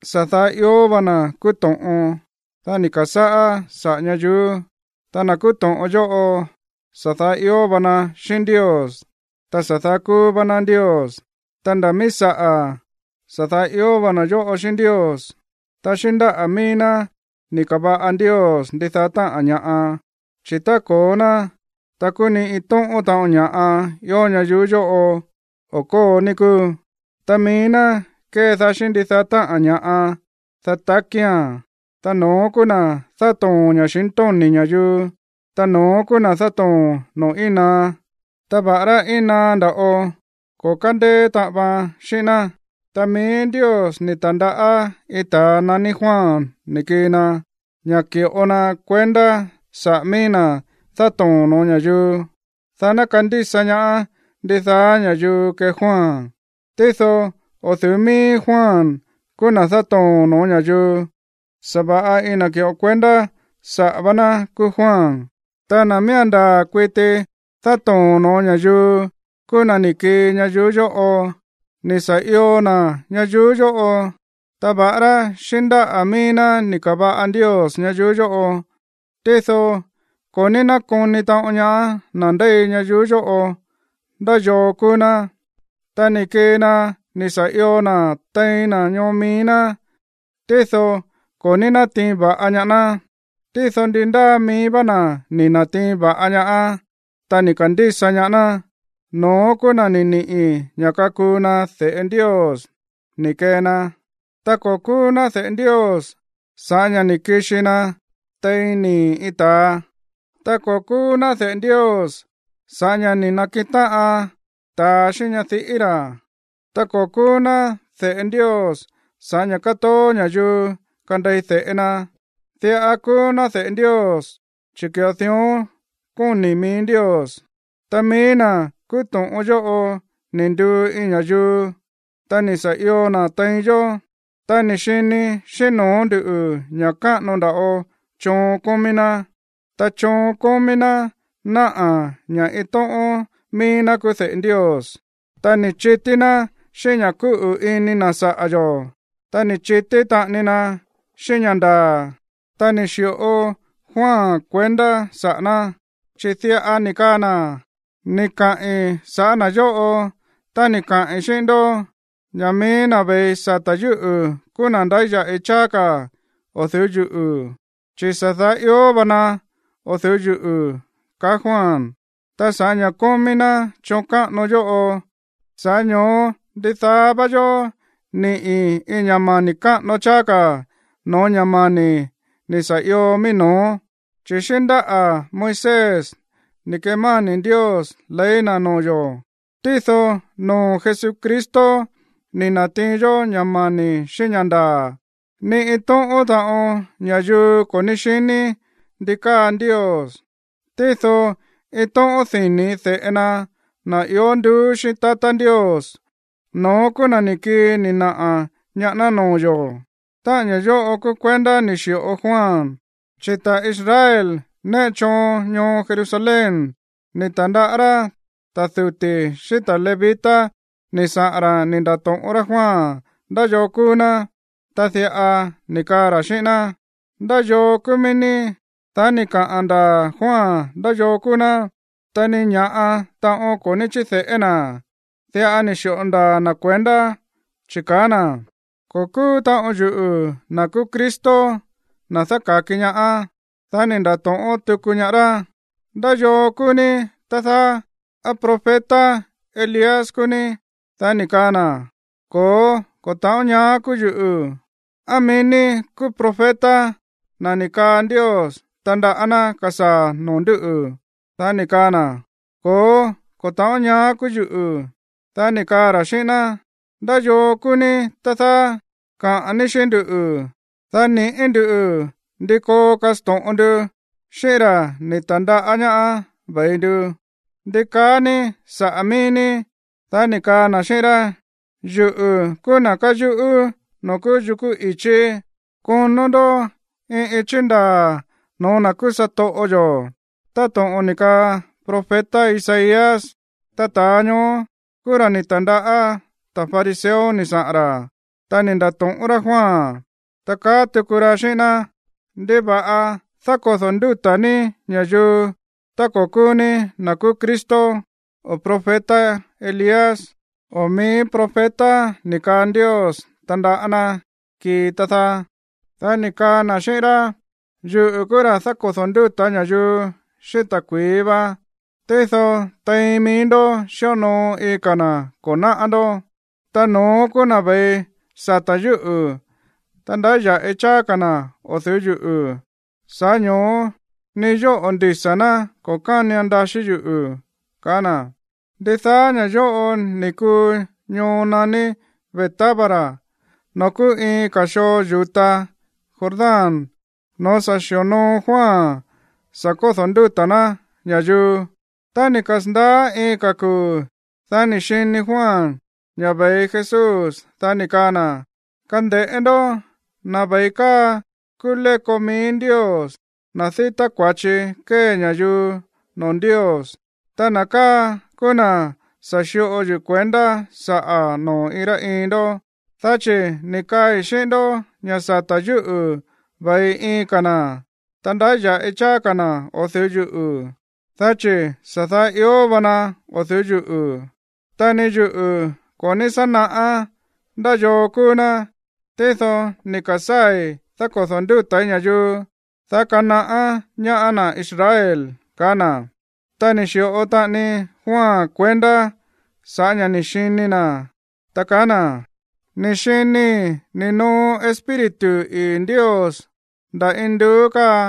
Sa̱ daá ió va na̱ kúú to̱ꞌon, dá ni̱ ka̱sáꞌá saꞌa̱ ñayuú, ta na̱ kúú to̱ꞌon yóꞌo sa̱ daá ió va na xíꞌín Ndios, ta sa̱ daá kúú vá ná Ndios. Ta ndá mií saꞌa̱, sa̱ daá ió va na̱ yóꞌo xíꞌín Ndios. Ta xíꞌín ndáꞌa̱ mií ná ni̱ ka̱va̱ꞌa Ndios ndidaá táꞌa̱n ña̱ꞌa. Chi̱ tá ko̱ó ná, ta kúú ni iin tóꞌón taꞌon ña̱ꞌa ió ñayuú yóꞌo o̱ kóo, ní kúu. Ta mií ná kédaá xíꞌín ndidaá táꞌa̱n ña̱ꞌa, dá takía̱n, ta no̱ón kúú na̱ dátoo̱n ña̱xintóni̱ ña̱yuu. Ta no̱ón kúú na̱ dátoo̱n noo̱ íin naá, ta va̱ꞌará íin naá nda̱ꞌo, ko̱ kándéé taꞌan vaan xíꞌín ná. Ta mií Ndios ni̱ ta̱ndaꞌá iin ta̱a naní Juan ni̱ kii na, ña̱ ki̱ꞌo na kuendá saꞌa̱ mií na̱ dátoo̱n no̱ó ña̱yuu, dá ná kandísa ñaá ndidaá ña̱yuu kee Juan. Tído o̱ du̱ú míí Juan kúú na̱ dátoo̱n no̱ó ña̱yuu, sa̱va̱ꞌa iin na̱ ki̱ꞌo kuendá saꞌa̱ vá ná kúú Juan. Ta na̱ miía̱n ndaa̱ kuiti dátoo̱n no̱ó ña̱yuu kúú na̱ ni̱ kii ñayuú yóꞌo. Ni̱ sa̱ io na̱ ñayuú yóꞌo, ta va̱ꞌará xíꞌín ndáꞌa̱ mií ná ni̱ ka̱va̱ꞌa Ndios ñayuú yóꞌo, tído ko̱ ní nákoni taꞌon ñaá na̱ ndéi ñayuú yóꞌo ndá yoo kúú ná. Ta ni̱ kii na ni̱ sa̱ io na̱ tein na̱ ñoo mií ná, tído ko̱ ní natiin va̱ꞌa ñaá ná. Tído ndi ndáa mií vá na̱ ni̱ na̱tiin va̱ꞌa ñaá, ta ni̱ ka̱ndísa ñaá ná, no̱ón kúú na̱ ni̱ ni̱ꞌi ña̱ kakuu na de̱ꞌe Ndios ni̱ kee na. Ta ko̱ kúú ná de̱ꞌe Ndios sa̱ꞌá ña̱ ni̱ kixi na tein nii̱ iin ta̱a, ta ko̱ kúú ná de̱ꞌe Ndios sa̱ꞌá ña̱ ni̱ na̱kiꞌin táꞌan ta̱a xíꞌín ñadiꞌí ra̱, ta ko̱ kúú ná de̱ꞌe Ndios sa̱ꞌá ña̱ kátoó ña̱yuu kandei de̱ꞌe na. Diꞌa kúú ná de̱ꞌe Ndios, chi̱ ki̱ꞌo dión kóni̱ mií Ndios. Ta mií na̱ kúú to̱ꞌon yóꞌo ni̱ nduu iin ña̱yuu, ta ni̱ sa̱ io na̱ tein yó, ta ni̱ xini xíꞌín no̱ó ndu̱ ña̱ káꞌano nda̱ꞌo choon kómí ná, ta choon kómí ná náꞌa̱ ña̱ iin tóꞌón mií ná kúú de̱ꞌe Ndios. Ta ni̱ chití ná xíꞌín ña̱ kúꞌu̱ ini na̱ saꞌa̱ yo̱, ta ni̱ chití taꞌani na xíꞌín ña̱ ndaa̱. Ta ni̱ xi̱ꞌo Juan kuendá saꞌa̱ ná, chi̱ diꞌa ni̱ kaa na̱: ―Ni̱ kaꞌi̱n sa̱ꞌá na̱ yóꞌo tá ni̱ kaꞌi̱n xíꞌín ndó ña̱ mií na̱ ve̱i sata̱ yúꞌu̱ kúú na̱ ndáya̱ꞌi cháá ka̱ o̱ du̱ú yuꞌu̱. Chi̱ sa̱ daá ió va na o̱ du̱ú yuꞌu̱ ―kaá Juan. Ta sa̱ꞌá ña̱ kómí ná choon káꞌano yóꞌo, sa̱ꞌá ño̱ó ndidaá vá yó níꞌi̱ iin ña̱ mani̱ káꞌano cháá ka̱ no̱ó ña̱ mani̱ ni̱ sa̱ io mií no̱ó. Chi̱ xíꞌín ndáꞌa̱ Moisés ni̱ kemáni̱ Ndios ley na̱ noo̱ yo̱, tído noo̱ Jesucristo ni̱ na̱tiin yó ña̱ mani̱ xíꞌín ña̱ ndaa̱. Ni iin tóꞌón taꞌon ña̱yuu ko̱ ní xiní ndí káa Ndios, tído iin tóꞌón dini̱ de̱ꞌe na, na̱ ió nduú xíꞌín tatá Ndios, no̱ón kúú na̱ ni̱ kii ni̱ naꞌa̱ ñaá ná noo̱ yo̱. Táꞌa̱n ña̱ yóꞌo kúú kuendá ni̱ xi̱ꞌo Juan, chi̱ ta̱ Israel néꞌe choon ñoo Jerusalén ni̱ ta̱ndaꞌá rá ta̱ duti̱ xíꞌín ta̱ levita ni̱ saꞌa̱n ra̱ ni̱ nda̱to̱ꞌón rá Juan ndá yoo kúú ná, ta diꞌa ni̱ kaa ra̱ xíꞌín ná: ―¿Ndá yoo kúú mií ní? Dá ni̱ kaꞌa̱n ndaa̱ Juan ndá yoo kúú ná. Ta ni ña̱ꞌa taꞌon ko̱ ní chíde̱ꞌé na̱, diꞌa ni̱ xi̱ꞌo ndaa̱ na̱ kuendá, chi̱ kaá na̱: ―Ko̱ kúú taꞌon yuꞌu̱ na̱ kúú Cristo, na̱ dáka̱ki ñaá. Dá ni̱ nda̱to̱ꞌón tuku ñaá rá: ―¿Ndá yoo kúú ní, tá dáá? ¿Á profeta Elías kúú ní? Dá ni̱ kaa na̱: ―Ko̱ó, ko̱ ta̱ꞌón ñaá kúú yuꞌu̱. ―¿Á mií ní kúú profeta, na̱ ni̱ kaa Ndios tandaꞌá ná kasaa̱ noo̱ ndúꞌu̱? ―kaá ra̱. Dá ni̱ kaa na̱: ―Ko̱ó, ko̱ ta̱ꞌón ñaá kúú yuꞌu̱. Dá ni̱ kaa ra̱ xíꞌín ná: ―¿Ndá yoo kúú ní, tá dáá? Kaꞌa̱n ní xíꞌín ndú, dá niꞌi̱ ndú ndi koo kasto̱ꞌon ndu xíꞌín ra̱ ni̱ ta̱ndaꞌá ñaá ve̱i ndu. ¿Ndi kaá ní saꞌa̱ mií ní? Dá ni̱ kaa na̱ xíꞌín rá: ―Yuꞌu̱ kúú na̱ káyuꞌú noo̱ kúú yukú i̱chí: “Konó ndó iin íchi̱ ndaa̱ noo̱ na̱ kúú satoꞌo yo̱” ―táto̱ꞌon ni̱ kaa profeta Isaías. Ta ta̱a ñoó kúú ra̱ ni̱ ta̱ndaꞌá ta̱ fariseo ni̱ saꞌa̱n ra̱, ta ni̱ nda̱to̱ꞌón rá Juan, ta kaá tuku ra̱ xíꞌín ná: ―¿Ndiva̱ꞌa dákodo̱ ndúta̱ ní ña̱yuu tá ko̱ kúú ní na̱ kúú Cristo, o profeta Elías o mií profeta ni̱ kaa Ndios tandaꞌá ná kii, tá dáá? Dá ni̱ kaa na̱ xíꞌín rá: ―Yuꞌu̱ kúú ra̱ dákodo̱ ndúta̱ ña̱yuu xíꞌín ta̱kui̱í va, tído tein mií ndó xíonoo iin ka̱ na̱ ko̱ náꞌá ndó. Ta no̱ón kúú na̱ ve̱i sata̱ yúꞌu̱, ta ndáya̱ꞌi cháá ka̱ na̱ o̱ du̱ú yuꞌu̱, sa̱ꞌá ño̱ó ni yóꞌo̱ ndisa̱ ná ko̱ kánian ndaxí yuꞌu̱ ―kaá na̱. Ndidaá ña̱ yóꞌo ni̱ kuu ñoo naní Betábara noo̱ kúú iin ka̱ xoo yu̱ta Jordán noo̱ sa̱ xi̱onoo Juan sa̱ da̱kódo̱ ndúta̱ ná ña̱yuu. Tá ni̱ kasa̱ndaá iin ka̱ kuu̱, dá ni̱ xini Juan ña̱ ve̱i Jesús, dá ni̱ kaa na̱: ―Kande̱ꞌé ndó, na̱ ve̱i káa kúú léko mií Ndios, na̱ dítá kua̱chi kómí ña̱yuu noo̱ Ndios. Ta na̱ káa kúú na̱ sa̱ xi̱ꞌo yuꞌu̱ kuendá saꞌa̱ noo̱ iin rá iin ndó, dá chi̱ ni̱ kaai̱ xíꞌín ndó ña̱ sata̱ yúꞌu̱ ve̱i iin ka̱ na̱, ta ndáya̱ꞌi cháá ka̱ na̱ o̱ du̱ú yuꞌu̱, dá chi̱ sa̱ daá ió va na o̱ du̱ú yuꞌu̱. Ta ni yuꞌu̱ ko̱ ní sá naꞌá ndá yoo kúú ná, tído ni̱ ka̱sáa̱i̱ dákodo̱ ndúta̱í ña̱yuu, dá kanaꞌá ñaá na̱ Israel ―kaá na̱. Ta ni̱ xi̱ꞌo taꞌani Juan kuendá sa̱ꞌá ña̱ ni̱ xini na̱, ta kaá na̱: ―Ni̱ xinii̱ ni̱ noo Espíritu ii̱ Ndios nda̱ induú káa,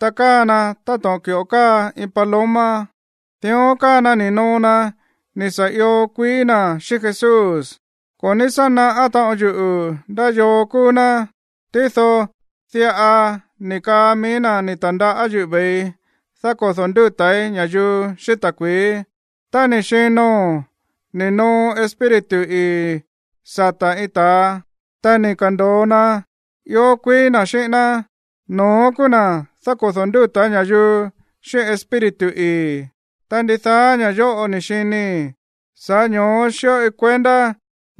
ta káa na táto̱ꞌon ki̱ꞌo káa iin paloma, dión káa na ni̱ noo na ni̱ sa̱ io kuií na̱ xíꞌín Jesús. Ko̱ ní sá naꞌá taꞌon yuꞌu̱ ndá yoo kúú ná, tído diꞌa ni̱ kaa mií na̱ ni̱ ta̱ndaꞌá yuꞌu̱ ve̱i dákodo̱ ndúta̱í ña̱yuu xíꞌín ta̱kui̱í: “Tá ni̱ xino̱n ni̱ noo Espíritu ii̱ sata̱ iin ta̱a, ta ni̱ ka̱ndo̱o na ió kuií na̱ xíꞌín ná, no̱ón kúú na̱ dákodo̱ ndúta̱ ña̱yuu xíꞌín Espíritu ii̱.” Ta ndidaá ña̱ yóꞌo ni̱ xinii̱, sa̱ꞌá ño̱ó xíꞌoi kuendá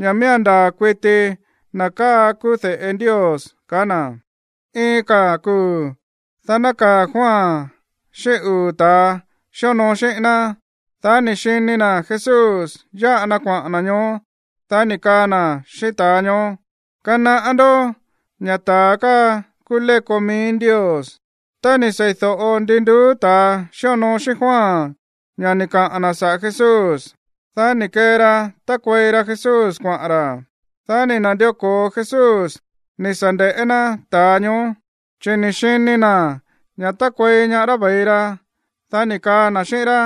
ña̱ miía̱n ndaa̱ kuiti na̱ káa kúú de̱ꞌe Ndios ―kaá na̱. Iin ka̱ kuu̱, dá nákaa̱ Juan xíꞌín uu̱ ta̱a xíonoo xíꞌín ná. Dá ni̱ xini na̱ Jesús yáꞌa na kuaꞌa̱n na̱ ñoó, dá ni̱ kaa na̱ xíꞌín ta̱a ñoó: ―Kanaꞌá ndó ña̱ ta̱a káa kúú léko mií Ndios. Tá ni̱ seídóꞌo ndi nduú ta̱a xíonoo xíꞌín Juan ña̱ ni̱ kaꞌa̱n na̱ saꞌa̱ Jesús, dá ni̱ kee ra tákuei ra Jesús kuaꞌa̱n ra̱. Dá ni̱ na̱ndió ko̱o Jesús ni̱ sa̱ nde̱ꞌé ná ta̱a ñoó, chi̱ ni̱ xini na̱ ña̱ tákuei ñaá rá ve̱i ra. Dá ni̱ kaa na̱ xíꞌín rá: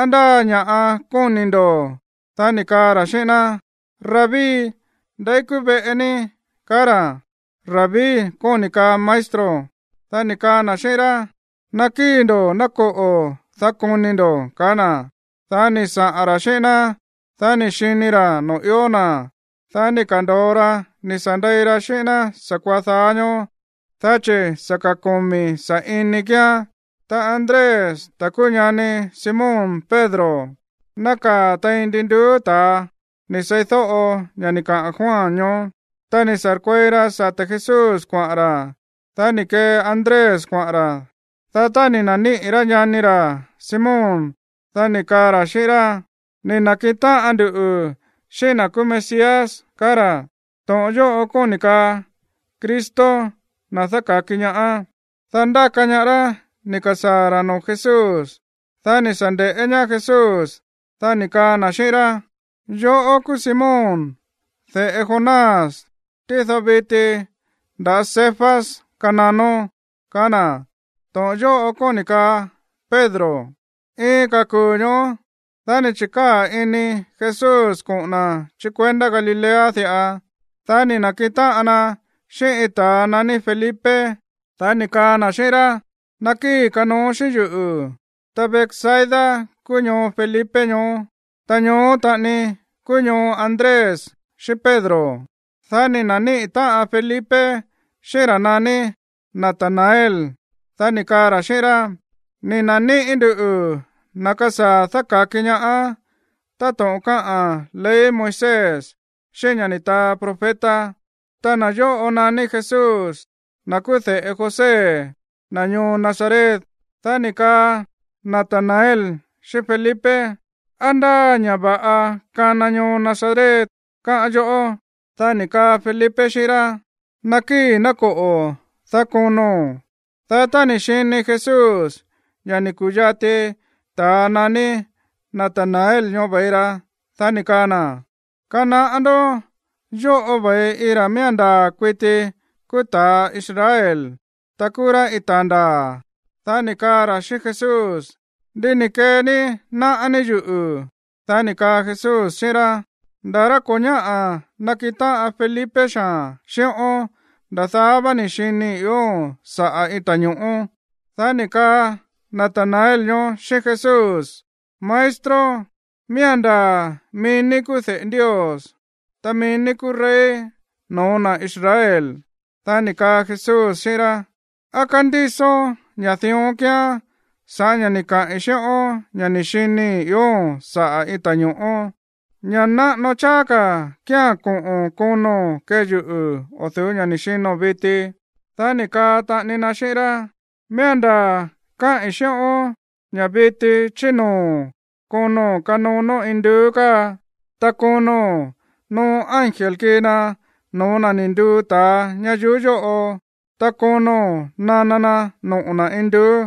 ―¿Á ndá ña̱ꞌa kóni̱ ndo̱? Dá ni̱ kaa ra̱ xíꞌín ná: ―Rabí, ¿ndeí kúú veꞌe ní? ―kaá ra̱. (Rabí kóni̱ kaa maestro.) Dá ni̱ kaa na̱ xíꞌín rá: ―Nakíi̱ ndo̱ ná koꞌo̱, dá koni ndo̱ ―kaá na̱. Dá ni̱ saꞌa̱n ra̱ xíꞌín ná, dá ni̱ xini ra̱ noo̱ ió na̱. Dá ni̱ ka̱ndo̱o ra ni̱ sa̱ ndei ra xíꞌín ná sa̱kuaá dáá ñóó, dá chi̱ sa̱ ka̱ komi̱ sa̱ꞌini kíán. Ta Andrés, ta̱ kúú ñani Simón Pedro, nákaa̱ tein ndi nduú ta̱a ni̱ seídóꞌo ña̱ ni̱ kaꞌa̱n Juan ñoó, ta ni̱ sa̱rkuei ra sata̱ Jesús kuaꞌa̱n ra̱. Dá ni̱ kee Andrés kuaꞌa̱n ra̱. Dá tá ni̱ na̱níꞌi̱ rá ñani ra̱ Simón, dá ni̱ kaa ra̱ xíꞌín rá: ―Ni̱ na̱kiꞌin táꞌan ndu xíꞌín na̱ kúú Mesías ―kaá ra̱. (To̱ꞌon yóꞌo kóni̱ kaa Cristo, na̱ dáka̱ki ñaá.) Dá ndáka ñaá rá ni̱ ka̱sáa̱ ra̱ noo̱ Jesús. Dá ni̱ sa̱ nde̱ꞌé ñaá Jesús, dá ni̱ kaa na̱ xíꞌín rá: ―Yoꞌó kúú Simón, de̱ꞌe Jonás, tído viti nda̱ Cefas kananón ―kaá na̱. (To̱ꞌon yóꞌo kóni̱ kaa Pedro.) Iin ka̱ kuu̱ ñoó, dá ni̱ chi̱kaa̱ ini Jesús koꞌo̱n na̱ chí kuendá Galilea diꞌa. Dá ni̱ na̱kiꞌin táꞌan na xíꞌín iin ta̱ naní Felipe, dá ni̱ kaa na̱ xíꞌín rá: ―Nakíi̱, kanooón xíꞌín yuꞌu̱. Ta Betsaida kúú ñoo Felipe ñoó, ta ñoó taꞌani kúú ñoo Andrés xíꞌín Pedro. Dá ni̱ na̱níꞌi̱ táꞌan Felipe xíꞌín ra̱ naní Natanael, dá ni̱ kaa ra̱ xíꞌín rá: ―Ni̱ na̱níꞌi̱ nduꞌu̱ na̱ kasaa̱ dáka̱ki ñaá táto̱ꞌon káꞌa̱n ley Moisés xíꞌín ña̱ ni̱ taa profeta. Ta na̱ yóꞌo naní Jesús, na̱ kúú de̱ꞌe José, na̱ ñoo Nazaret. Dá ni̱ kaa Natanael xíꞌín Felipe: ―¿Á ndáa ña̱ va̱ꞌa kana ñoo Nazaret, káꞌán yoꞌó? Dá ni̱ kaa Felipe xíꞌín rá: ―Nakíi̱ ná koꞌo̱, dá kono̱n. Dá tá ni̱ xini Jesús ña̱ ni̱ ku̱yati ta̱ naní Natanael ñoó ve̱i ra, dá ni̱ kaa na̱: ―Kanaꞌá ndó, yóꞌo ve̱i iin ra̱ miía̱n ndaa̱ kuiti kúú ta̱ Israel, ta kúú rá iin ta̱a ndaa̱. Dá ni̱ kaa ra̱ xíꞌín Jesús: ―¿Ndí ni̱ kee ní náꞌá ní yuꞌu̱? Dá ni̱ kaa Jesús xíꞌín rá: ―Nda̱ rá ko̱ ñáꞌa̱ nakiꞌin táꞌan Felipe xaa̱n xíꞌón, nda̱ daá vá ni̱ xinii̱ ióo̱n saꞌa̱ iin ta̱ño̱ꞌó. Dá ni̱ kaa Natanael ñoó xíꞌín Jesús: ―Maestro, miía̱n ndaa̱ mií ní kúú de̱ꞌe Ndios, ta mií ní kúú rey no̱ó na̱ Israel. Dá ni̱ kaa Jesús xíꞌín rá: ―¿Á kándísón ña̱ dión kíán sa̱ꞌá ña̱ ni̱ kaꞌi̱n xíꞌón ña̱ ni̱ xinii̱ ióo̱n saꞌa̱ iin ta̱ño̱ꞌó? Ña̱ náꞌano cháá ka̱ kía̱n koꞌo̱n kono̱n kee yuꞌu̱ o̱ du̱ú ña̱ ni̱ xino̱n viti. Dá ni̱ kaa taꞌani na xíꞌín rá: ―Miía̱n ndaa̱ káꞌi̱n xíꞌón ña̱ viti chí noo̱ kono̱n kanonó induú káa, ta kono̱n noo ángel kii na no̱ó na̱ ni̱ nduu ta̱a ñayuú yóꞌo, ta kono̱n nana na noꞌo̱ na̱ induú.